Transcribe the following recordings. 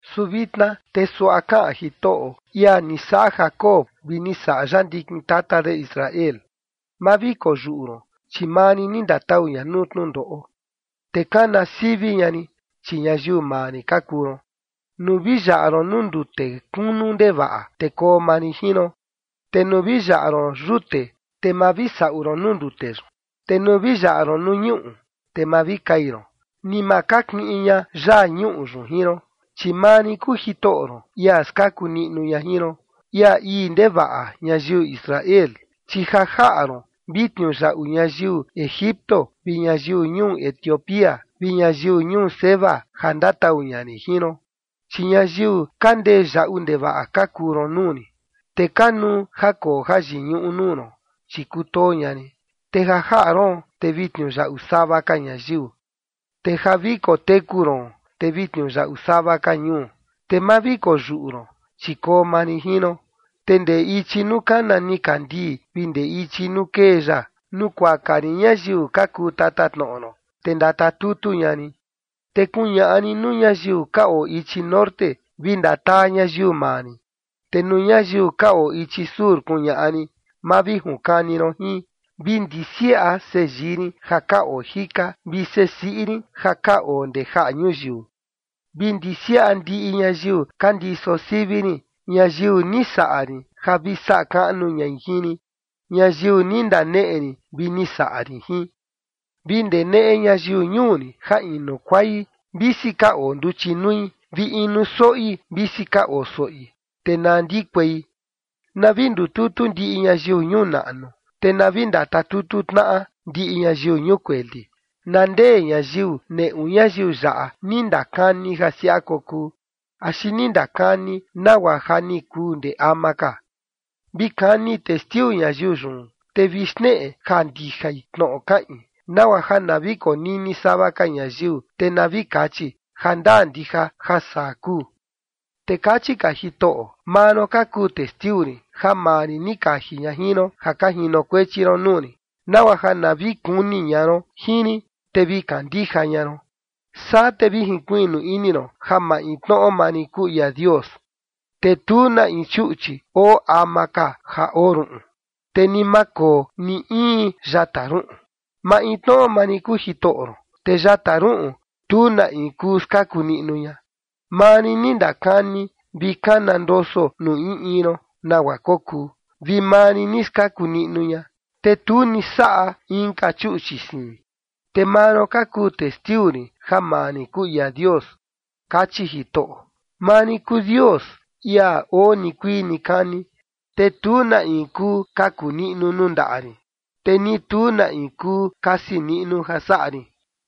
Su vitna te suaꞌa kaꞌan Jitoꞌo, ia ni saꞌa Jacob vi ni saꞌa ya ndikin tata de Israel: “Ma vi koyuꞌu ron, chi maa rin ni ndatau ña nuu tnundoꞌo, te kana sivi ña rin, chi ñayiu maa rin ka kuu ron. Nuu vi yaꞌa ron nuu ndute kunu ndevaꞌa, te koo maa rin jin ron, te nuu vi yaꞌa ron yute, te ma vi saꞌu ron nuu ndute yun, te nuu vi yaꞌa ron nuu ñuꞌu, te ma vi kai ron ni ma kakiꞌin ña yaa ñuꞌu yun jin ron. Chi maa rin kuu Jitoꞌo ron, ia skaku niꞌnu ña jin ron, ia ii ndevaꞌa ñayiu Israel, chi ja jaꞌa ron vi tniuyaꞌu ñayiu Egipto vi ñayiu ñuu Etiopía vi ñayiu ñuu Seba ja ndatau ña rin jin ron. Chi ñayiu ka ndee yaꞌu ndevaꞌa ka kuu ron nuu rin, te kanuu ja koo jayiñuꞌu nuu ron, chi kutoo ña rin. Te ja jaꞌa roon, te vi tniuyaꞌu sava ka ñayiu, te ja vi koteku ron, te vi tniuyaꞌu sava ka ñuu. Te ma vi koyuꞌu ron, chi koo maa rin jin ron, te ndee ichi nuu kana nikandii vi ndee ichi nuu kee ya nukuaka rin ñayiu ka kuu tatatnoꞌo ron, te ndatatutu ña rin. Te kuñaꞌa rin nuu ñayiu ka oo ichi norte: Vi ndataa ñayiu maa rin. Te nuu ñayiu ka oo ichi sur kuñaꞌa rin: Ma vi junkani ron jin. Vi ndisiaꞌa seyii rin ja ka oo jika, vi sesiꞌi rin ja ka oo ndee jaꞌa ñuyiu. Vi ndisiaꞌa ndiꞌi ñayiu ka ndiso sivi rin, ñayiu ni saꞌa rin ja vi saꞌa kaꞌnu ñai jin rin, ñayiu ni ndaneꞌe rin vi ni saꞌa rin jin. ’Vi ndeneꞌe ñayiu ñuu rin ja inu kuai, visi ka oo nduchi nui, vi inu soꞌi visi ka oo soꞌi, te na ndikuei. Na vi ndututu ndiꞌi ñayiu ñuu naꞌnu te na vi ndatatutu tnaꞌa ndiꞌi ñayiu ñuu kueli. ¿Na ndee ñayiu neꞌu ñayiu yaꞌa ni ndakani ja siaꞌa kokuu axi ni ndakani nagua ja ni kuu ndee ama ka? Vi kani testiu ñayiu yun, te vi xneꞌe ja ndijai tnoꞌo kaꞌin, nagua ja na vi konini sava ka ñayiu, te na vi kachi: Jandaa ndija ja saa kuu.” Te kachi ka Jitoꞌo: “Maa ron ka kuu testiu rin, ja maa rin ni kaji ña jin ron, ja ka jinokuechi ron nuu rin, nagua ja na vi kuni ña ron jin rin, te vi kandija ña ron, saa te vi jinkuiꞌnu ini ron ja maintnoꞌo maa rin kuu ia Dios, te tu na in chuꞌchi oo ama ka ja oo ruꞌun, te ni ma koo ni in yata ruꞌun. Maintnoꞌo maa rin kuu Jitoꞌo ron, te yata ruꞌun tu na in kuu skaku niꞌnu ña. Maa rin ni ndakani vi kana ndoso nuu in in ron nagua kokuu, vi maa rin ni skaku niꞌnu ña, te tu ni saꞌa inka chuꞌchi siin. Te maa ron ka kuu testiu rin ja maa rin kuu ia Dios”, kachi Jitoꞌo. “Maa rin kuu Dios, ia oo nikuii nikani, te tu na in kuu kaku niꞌnu nuu ndaꞌa rin, te ni tu na in kuu kasi niꞌnu ja saꞌa rin.”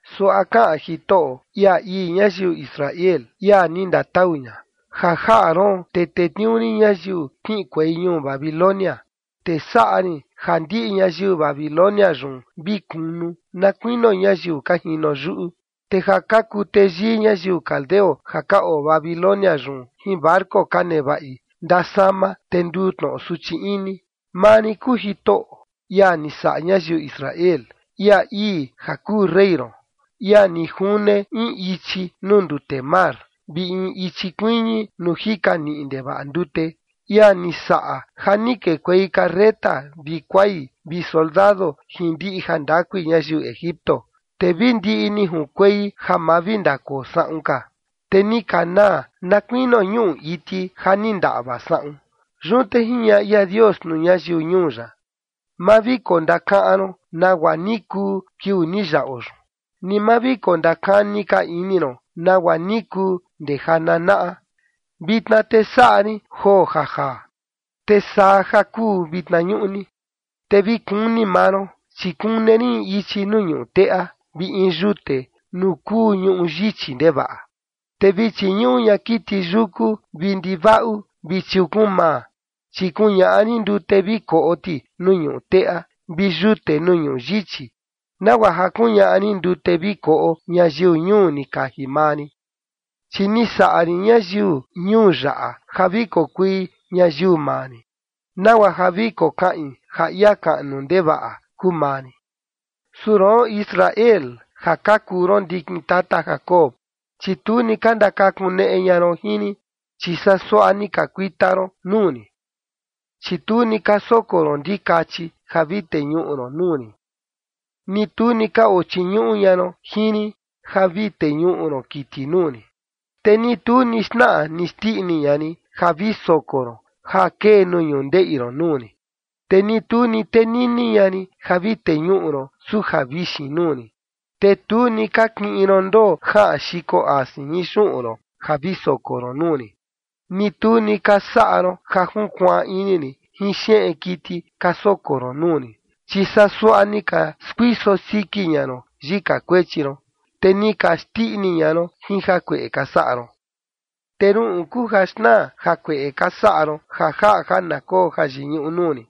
Suaꞌa kaꞌan Jitoꞌo, ia ii ñayiu Israel, ia ni ndatau ña: “Ja jaꞌa roon, te tetniuu rin ñayiu kiꞌinkuei ñuu Babilonia, te saꞌa rin ja ndiꞌi ñayiu Babilonia yun vi kunu, na kuinio ñayiu ka jino yuꞌu. Te ja ka kuu teyii ñayiu caldeo ja ka oo Babilonia yun jin barco ka nevaꞌi, ndasama te nduu tnoꞌo suchi ini. Maa rin kuu Jitoꞌo, ia ni saꞌa ñayiu Israel, ia ii ja kuu rey ron, ia ni june in ichi nuu ndute mar vi in ichi kuiñi nuu jika niꞌi ndevaꞌa ndute, ia ni saꞌa ja ni kekuei carreta vi kuai vi soldado jin ndiꞌi jandakui ñayiu Egipto, te vi ndiꞌi ni junkuei ja ma vi ndakoo saꞌun ka, te ni ka naa, na kuinio ñuꞌu iti ja ni ndaꞌva saꞌun.” Yun te jiñaꞌa ia Dios nuu ñayiu ñuu ya: “Ma vi kondakaꞌan ron nagua ni kuu kiuu ni yaꞌo yun, ni ma vi kondakani ka ini ron nagua ni kuu ndee jananaꞌa. Vitna te saꞌa rin joo ja jaa, te saa ja kuu vitna ñuꞌni, te vi kuni maa ron, chi kune rin in ichi nuu ñuꞌu teꞌa vi in yute nuu kuu ñuꞌu yichi ndevaꞌa. Te vi chiñuꞌu ña kiti yuku vi ndivaꞌu vi chiukun-maa, chi kuñaꞌa rin ndute vi koꞌo ti nuu ñuꞌu teꞌa vi yute nuu ñuꞌu yichi, nagua ja kuñaꞌa rin ndute vi koꞌo ñayiu ñuu ni kaji maa rin. Chi ni saꞌa rin ñayiu ñuu yaꞌa ja vi kokui ñayiu maa rin, nagua ja vi kokaꞌin ja ia kaꞌnu ndevaꞌa kuu maa rin. ’Su roon, Israel, ja ka kuu ron ndikin tata Jacob, chi tu ni ka ndakakuneꞌe ña ron jin rin, chi saa suaꞌa ni ka kuita ron nuu rin. Chi tu ni ka soko ron ndikachi ja vi teñuꞌu ron nuu rin, ni tu ni ka ochiñuꞌu ña ron jin rin ja vi teñuꞌu ron kiti nuu rin. Te ni tu ni xnaꞌa ni xndiꞌni ña rin ja vi soko ron ja kee nuu ñundeꞌi ron nuu rin, te ni tu ni tenini ña rin ja vi teñuꞌu ron suja vixin nuu rin. Te tu ni ka kiꞌin ron ndoo jaꞌan xiko asin jin xuꞌun ron ja vi soko ron nuu rin, ni tu ni ka saꞌa ron ja junkuaan ini rin jin xeꞌen kiti ka soko ron nuu rin, chi saa suaꞌa ni ka skuiso siki ña ron yika kuechi ron, te ni ka xndiꞌni ña ron jin jakueꞌe ka saꞌa ron. ’Te ruꞌun kuu ja xnaa jakueꞌe ka saꞌa ron ja jaꞌa ja na koo jayiñuꞌu nuu rin,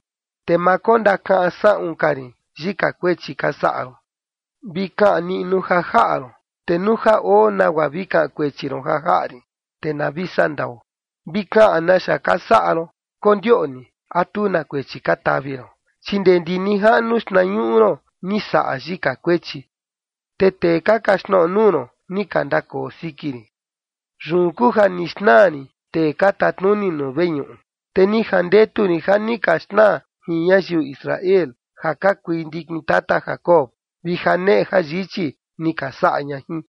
te ma kondakaꞌan saꞌun ka rin yika kuechi ka saꞌa ron. Vi kaꞌan niꞌnu ja jaꞌa ron, te nuu ja oo nagua vi kaꞌan kuechi ron ja jaꞌa rin, te na vi saꞌa ndao. Vi kaꞌan naxa ka saꞌa ron, kondioꞌni a tu na kuechi ka tavi ron. Chi ndee ndi nijaꞌnu xtnañuꞌu ron ni saꞌa yika kuechi, te tee ka kaxtnoꞌo nuu ron, ni ka ndakoo siki rin. Yun kuu ja ni xnaa rin tee ka tatnuni nuu veñuꞌu, te ni jandetu rin ja ni ka xnaa jin ñayiu Israel ja ka kui ndikin tata Jacob, vi janeꞌe jayichi ni ka saꞌa ña jin.”